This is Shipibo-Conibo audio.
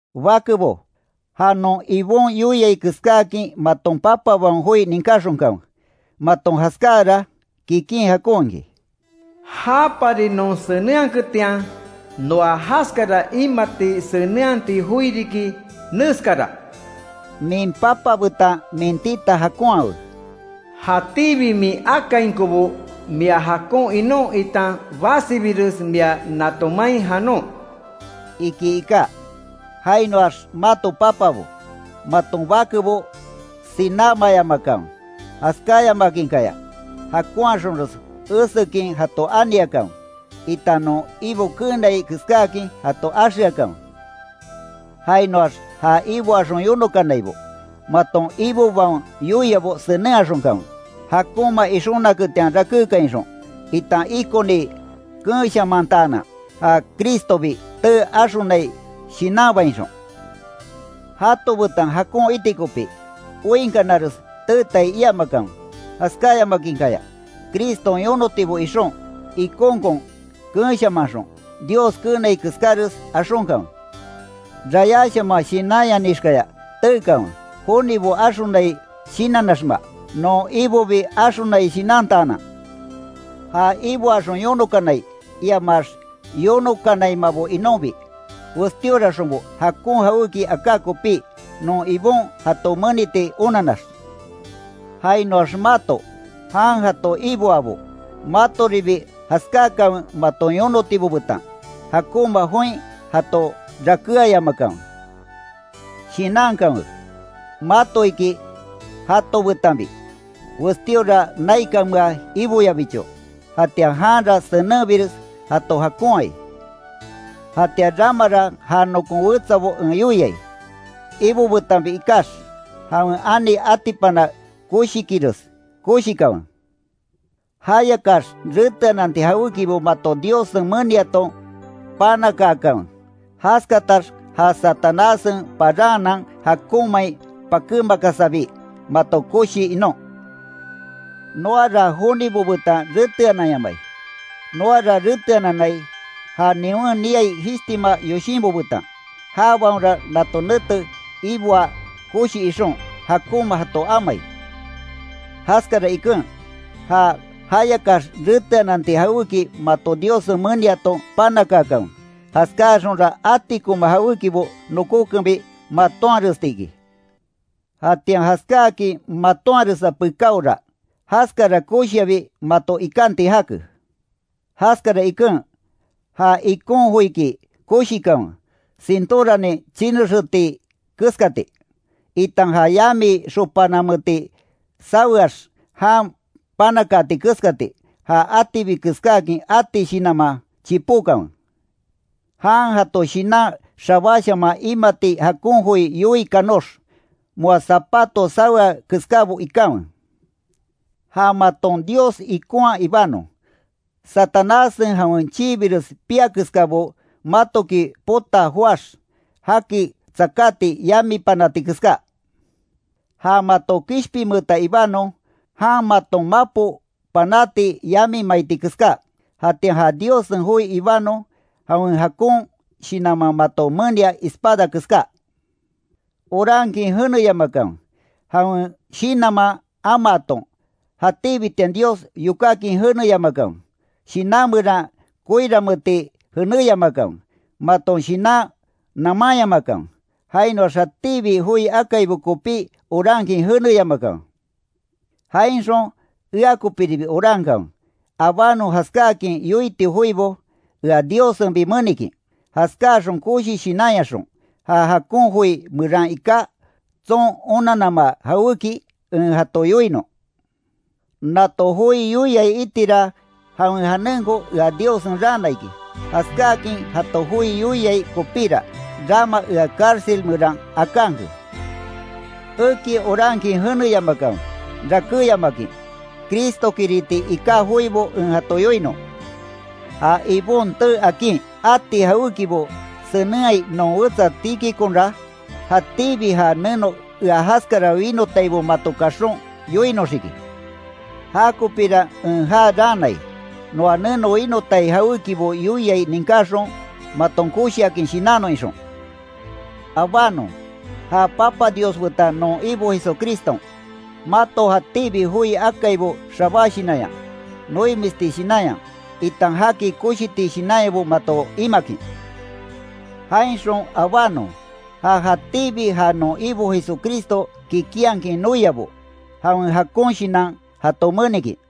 Bakebo, ja non Ibon yoiai keskáakin, maton papabaon joi ninkáxonkanwe. Maton jaskáara, kikin jakon iki. Japari non senenhaketian, noa jaskara imati senenhati joi riki, neskara: “Min papa betan min tita jakonhawe, jatíbi min akainkobo mia jakon inon, itan basibires mia nato main janon”, iki iká. Jainoax mato papabo, maton bakebo sinámayamakanwe. Jaskayamakinkaya, jakonhaxonres esekin jato aniakanwe, itan non Ibo keenai keskáakin jato axeakanwe. Jainoax ja iboaxon yonokanaibo, maton ibobaon yoiabo senenhaxonkanwe, jakonma ixonaketian rakékainxon, itan ikoni keenshamantaanan ja Cristobi tee axonai shinanbainxon. Jato betan jakon iti kopi, oinkanares teetai iamakanwe. Jaskayamakinkaya, Criston yonotibo ixon, ikonkon keenshamanxon, Dios keenai keskáres axonkanwe. Rayáshaman shinanyanixkaya teekanwe, jonibo axonai shinannaxma, non Ibobi axonai shinantaanan. Ja iboaxon yonokanai, iamax yonokanaimabo inonbi, westíoraxonbo jakon jawéki aká kopí, non Ibon jato meniti onannax. Jainoax mato, jan jato iboabo, matoribi jaskákanwe maton yonotibo betan. Jakonma join jato rakéayamakanwe. Shinankanwe, mato iki jato betanbi, westíora naikanmea Iboyabicho, jatian janra senenbires jato jakonhai. Jatian ramara ja nokon wetsabo en yoiai, Ibo betanbi ikax, jawen ani atipana koshikires koshikanwe. Jayakax reteananti jawékibo mato Diossen meniaton panakaakanwe, jaskatax ja Satanássen paranhanan jakonmain pakémakasabi, mato koshi inon. Noara jonibo betan reteananyamai, noara reteananai, ja niwen niai jishtima yoshinbo betan, jabaonra nato nete iboa koshi ixon, jakonma jato amai. Jaskara iken, ja jayakax reteananti jawéki mato Diossen meniaton panakaakanwe, jaskaxonra atikoma jawékibo nokókenbi matonharesti iki. Jatian jaskáakin matonharesa pekáora, jaskara koshiabi mato ikanti jake. Jaskara iken, ja ikon joiki koshikanwe, cintoranin chinexeeti keskati, itan ja yami xopanameti saweax jan panakaati keskati, ja atibi keskáakin ati shinanman, chipókanwe. Jan jato shinan xabáshaman imati jakon joi yoii kanox, moa zapato sawea keskábo ikanwe. Ja maton Dios ikonha ibanon, Satanássen jawen chiibires piá keskabo matoki potaa joáx, jaki tsakáti yami panáti keská. Ja mato kishpinmeeta ibanon, jan maton mapo panati yami maiti keská, jatian ja Diossen joi ibanon, jawen jakon Shinanman mato menia espada keská. Orankin jeneyamakanwe, jawen Shinanman amaaton, jatíbitian Dios yokákin jeneyamakanwe, shinan meran koiranmeeti jeneyamakanwe, maton shinan namanyamakanwe. Jainoax jatíbi joi akaibo kopí orankin jeneyamakanwe. Jainxon ea kopíribi orankanwe, abanon jaskáakin yoiti joibo ea Diossenbi menikin. Jaskáaxon koshi shinanyaxon, ja jakon joi meran iká, tson onannama jawéki en jato yoinon. Nato joi yoiai itira jawen janenko ea Diossen raana iki. Jaskáakin jato joi yoiai kopíra, rama ea cárcel meran akanke. Eki orankin jeneyamakanwe, rakéyamakin, Cristokiriti iká joibo en jato yoinon. Ja Ibon tee akin, ati jawékibo senenhaai non wetsa Tíquiconra, jatíbi ja neno ea jaskara winotaibo mato kaxon, yoinoxiki. Jakopíra en ja raanai, noa neno winotai jawékibo yoiai ninkaxon, maton koshiakin shinannon ixon. Abánon, ja Papa Dios betan non Ibo Jesucriston, mato jatíbi joi akaibo xabá shinanya, noimisti shinanya, itan jaki koshiti shinanyabo mato imakin, jainxon abánon, ja jatíbi ja non Ibo Jesucristo kikinhakin noiabo, jawen jakon shinan jato menikin.